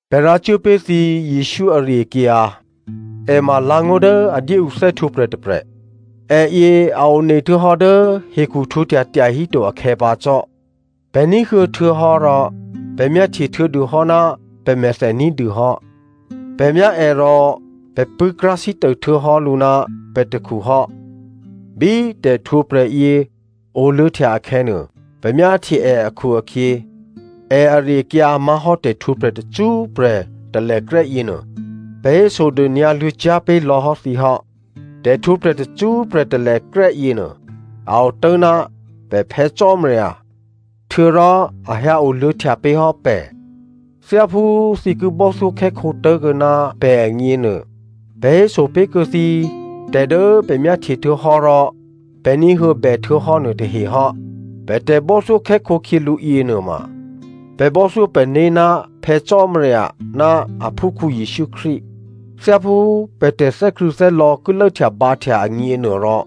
Pè̤ rǎ cuố pé̤ thǐ Jesǔ ari-akyǎ, è ma lǎ̤ngó̤ dố a dyé ǔ thè́htwǒprè̤ tôprè̤. Èyě a one htuô̌hò́ dố hekhu htwǒhtya tyahíto akhè̌ pǎ cò́. Pè̤ ní̤huô̌ htuô̌hò́ rò pè̤ myáhtye htuô̌dûhò́ ná pè̤mèthè ní̤dû hò́. Pè̤ myá è rò pè̤ pṳ̂́krá̤sítô htuô̌hò́ lǔ ná pè̤ takhu hò́. Bí tè̤htwǒprè̤ yě oluô̌htya akhè̌nuô, pè̤ myáhtye è akhu-akhyě, è ari-akyǎ má̤hò́ tè̤htwǒprè̤ tacṳ́prè̤ talèkrè́ yěnuô, pè̤ hésodônyǎ luô̌cyá̤ pé̤ lò̌ hò́ thǐ hò́. Tè̤htwǒprè̤ tacṳ́prè̤ talèkrè́ yěnuô, a otố̤ ná pè̤ Phè̌ Cò́marya htuô̌rò a hyǎ o luô̌htya pé̤ hò́ pè̤. Thyáphú thǐ ki bò́thyókhè́khǒ tố̤kuô̌ ná pè̤ agněnuô, pè̤ héso pé̤kuô̌ thǐ tè̤ dố pè̤ myáhtye htuô̌hò́ rò pè̤ ní̤huô̌bè htuô̌hò́ nuôtahe hò́. Pè̤ tè̤bò́thyókhè́khǒ khyělǔ yěnuôma, pè̤ bò́thyó pè̤né̤ ná Phè̌ Cò́marya ná aphúkhǔ Jesǔ Krístu. Thyáphú pè̤ tè̤thè́krṳ̂̌thè́lò̌ ki lốhtyabǎhtya agněnuôrò,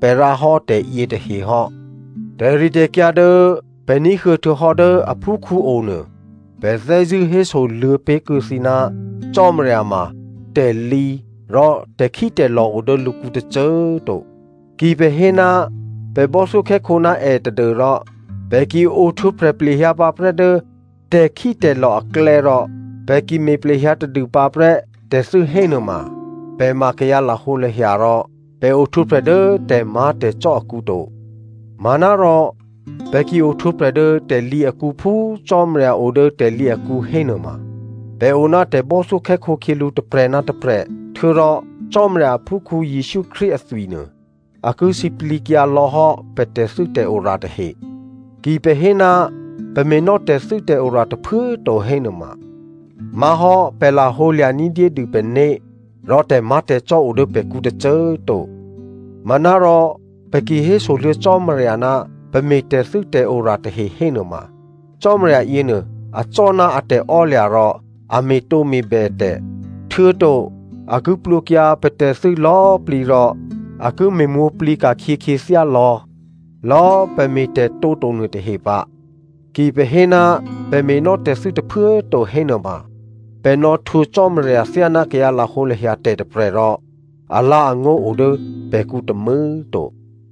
pè̤ rǎhò́ tè̤yětahe hò́. Tè̤ritè̤kyǎ dố pè̤ ní̤huô̌ htuô̌hò́ dố aphúkhǔ onuô, pè̤ thè́zṳ̂́ hésoluô̌ pé̤ kuô̌ thǐ, Cò́marya ma tè̤lǐ rò tè̤khítè̤lò̤ o dố lǔkǔ tôcô꤮ to. Ki pè̤ hé ná pè̤ bò́thyókhè́khǒ ná è tadû́rò pè̤ ki ohtwǒprè̤ plehyǎ pǎprè́ dố tè̤khítè̤lò̤ aklè̌ rò pè̤ ki me̤ plehyǎ tadû pǎprè́ tè̤thû́ hénuôma, pè̤ ma kayǎ lahǒlahya rò pè̤ ohtwǒprè̤ dố tè̤má̤tè̤cò́ akǔ to. Manárò pè̤ ki ohtwǒprè̤ dố tè̤lǐ akǔ phú Cò́marya o dố tè̤lǐ akǔ hénuôma, pè̤ o ná tè̤bò́thyókhè́khǒ khyělǔ tôprè̤ ná tôprè̤, htuô̌rò Cò́marya aphúkhǔ Jesǔ Krístu athwinuô a ki sǐplǐkyǎ lò̌ hò́ pè̤ tè̤thû́tè̤ora tahe. Ki pè̤ hé ná pè̤ me̤nò́ tè̤thû́tè̤ora tôphuố꤮ to hénuôma má̤hò́ pè̤ lahǒlya̤ní̤ dyédû pè̤né̤, rò tè̤má̤tè̤cò́ o dố pè̤kǔ tôcô꤮ to. Manárò pè̤ ki hésoluô̌ Cò́marya ná pè̤ me̤ tè̤thû́tè̤ora tahe hénuôma Cò́marya yěnuô acò́ ná a tè̤ò́lya̤ rò a me̤tǒme̤bè tè̤, htuô̌to a ki plwǒkyǎ pè̤ tè̤thû́ lò̌꤮ plǐ rò a ki me̤mwǒ̤plǐ ka̤khyě khyěthyá lò̌lò̌꤮ pè̤ me̤tè̤tǒ to nuôtahe pǎ. Ki pè̤ hé ná pè̤ me̤nò́ tè̤thû́ tôphuố꤮ to hénuôma pè̤ nò̌htwǒ Cò́marya thyáná kayǎ lahǒlahya tè̤ tôprè̤ rò alǎ̤angó̤ o dố pè̤kǔ tômû̌꤮ to.